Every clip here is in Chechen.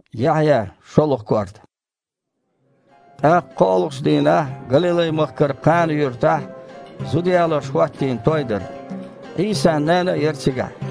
ТІаккха кхоалгІачу дийнахь Галилай-махкара Кхана-юьртахь зуда ялош хІоттийна той дара. Іийсан нана а яра цигахь.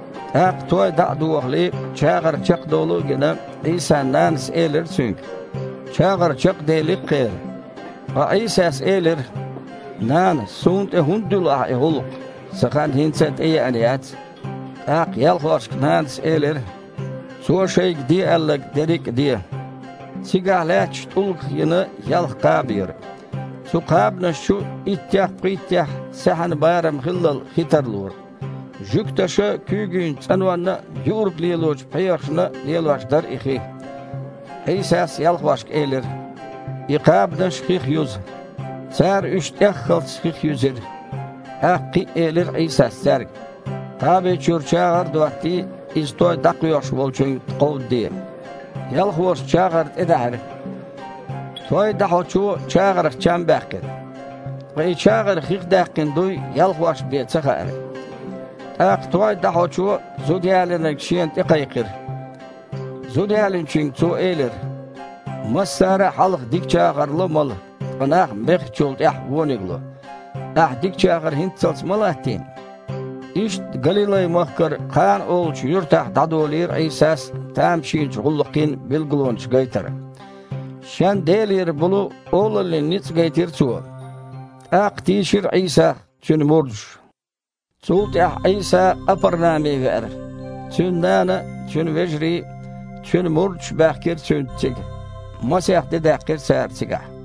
ТІаккха, той дІа а дохале, чагІар чекхдолу а гина, Іийсан нанас элира Цуьнга: «ЧагІар чекхдели-кх кхеран». Ткъа Іийсас элира: «Нана, Суна тІе хІунда дуьллу ахьа и гІуллакх? Сан хан хІинца а тІееана яц». ТІаккха ялхошка нанас элира: «Цо шайга де аьлларг дерриг а де». Цигахь лаьтташ тІулгах йина ялх кхаба яра. Цу кхабанаш чу иттех-пхийттех саьхьан барам хиллал хи тарлора. Жуьгташа куьйгийн цІанонна а, юург лелочу пхьегІашна а лелош дара и хи. Іийсас ялхошка элира: «И кхабанаш хих юза». Цара уьш тІеххалц хих юьзира. ТІаккха кхин а элира Іийсас цаьрга: «Кхаби чуьра чагІар а доттий, иза той дІакхоьхьуш волчуьнга кховдаде». Ялхоша чагІар тІедаьхьира. Той дІахьочо чагІарх чам баьккхира. Ткъа и чагІар хих даьккхина дуй ялхошна бен ца хаьара. ТІаккха той дІахьочо зудаялийнарг шена тІекхайкхира. Зудаялийначуьнга цо элира: «Массара а хьалха дика чагІар ло мала, ткъа нах бехначул тІаьхьа вониг ло. Ахь дика чагІар хІинццалц ма-латтийна?» Иштта Галилай-махкара Кхана олучу юьртахь дІадолийра Іийсас тамашийначу гІуллакхийн билгалонаш гайтар. Шен Делера болу олаллин ницкъ гайтира Цо, тІаккха тийшира Іийсах Цуьнан мурдаш. Цул тІаьхьа Іийса Къапарнаме веара. Цуьнан нана а, Цуьнан вежарий а, Цуьнан мурдаш а баьхкира Цуьнца цига. Масех де даьккхира цара цигахь.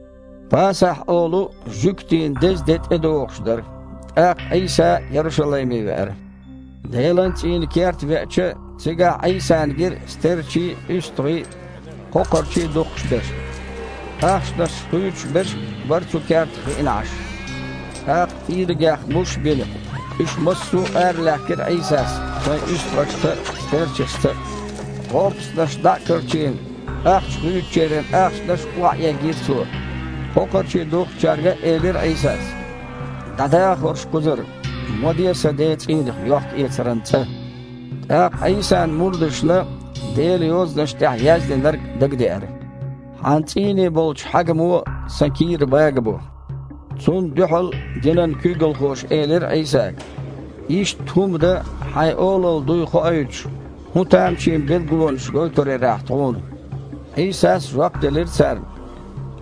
« Пасахь» олу жуьгтийн деза де тІедогІуш дара. ТІаккха Іийса Ярушалайме веара. Делан цІийнан керта веача, цигахь Іийсана гира стерчий а, уьстагІий а, кхокхарчий а духкуш берш. Ахчанаш хуьйцуш берш а бара цу кертахь хиъна Іаш. ТІаккха тІийрагех муш а бина, уьш массо а аралаьхкира Іийсас шайн уьстагІашца а, стерчашца а. ГІопастанаш дІа а карчийна, ахча хуьйцучеран ахчанаш а охьаэгийра Цо. Кхокхарчий духкучаьрга а элира Іийсас: «ДІадаха хІорш кхузара! Ма диэ Сан Ден цІийнах йохкаэцаран цІа!» ТІаккха Іийсан мурдашна Делан Йозанаш тІехь яздинарг дагадеара: «Хьан цІийне болчу хьагамо Сан кийра багабо». Цунна дуьхьал динан куьйгалхоша элира Іийсага: «Иштта хІума дан хьайн олалла дуй хоуьйтуш хІун тамашийна билгалонаш гойтур яра Ахь тхуна?» Іийсас жоп делира царна: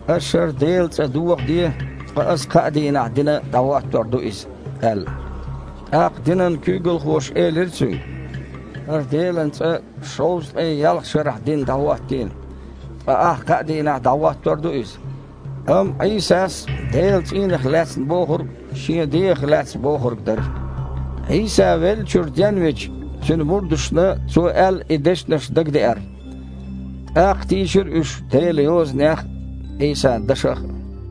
«Аш хІара Делан цІа дохаде, ткъа Ас кхаа дийнахь дина дІахІоттор ду иза», – аьлла. ТІаккха динан куьйгалхоша элира Цуьнга: «ХІара Делан цІа шовзткъе ялх шарахь дина дІахІоттийна, ткъа Ахь кхаа дийнахь дІахІоттор ду иза?» Амма Іийсас Делан цІийнах лаьцна бохург Шен дегІах лаьцна бохург дара. Іийса веллачуьра денвича, Цуьнан мурдашна Цо аьлла и дешнаш дагадеара. ТІаккха тийшира уьш Делан Йозанех а, Іийсан дашах а.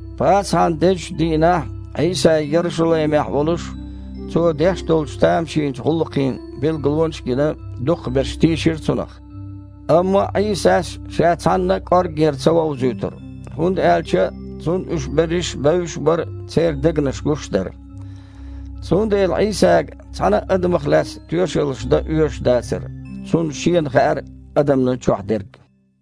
Пасахьан дезачу дийнахь, Іийса Ярушалаймехь волуш, Цо деш долчу тамашийначу гІуллакхийн билгалонаш а гина, дукхахберш тийшира Цунах. Амма Іийсас Ша цхьанна а кІорггера ца вовзуьйтура, хІунда аьлча Цунна уьш берриш бевзаш а бара, церан дегнаш гуш а дара. Цундела Іийсага цхьана а адамах лаьцна тоьшаллаш дан оьшуш дацара. Цунна Шена хаьара адамна чохь дерг.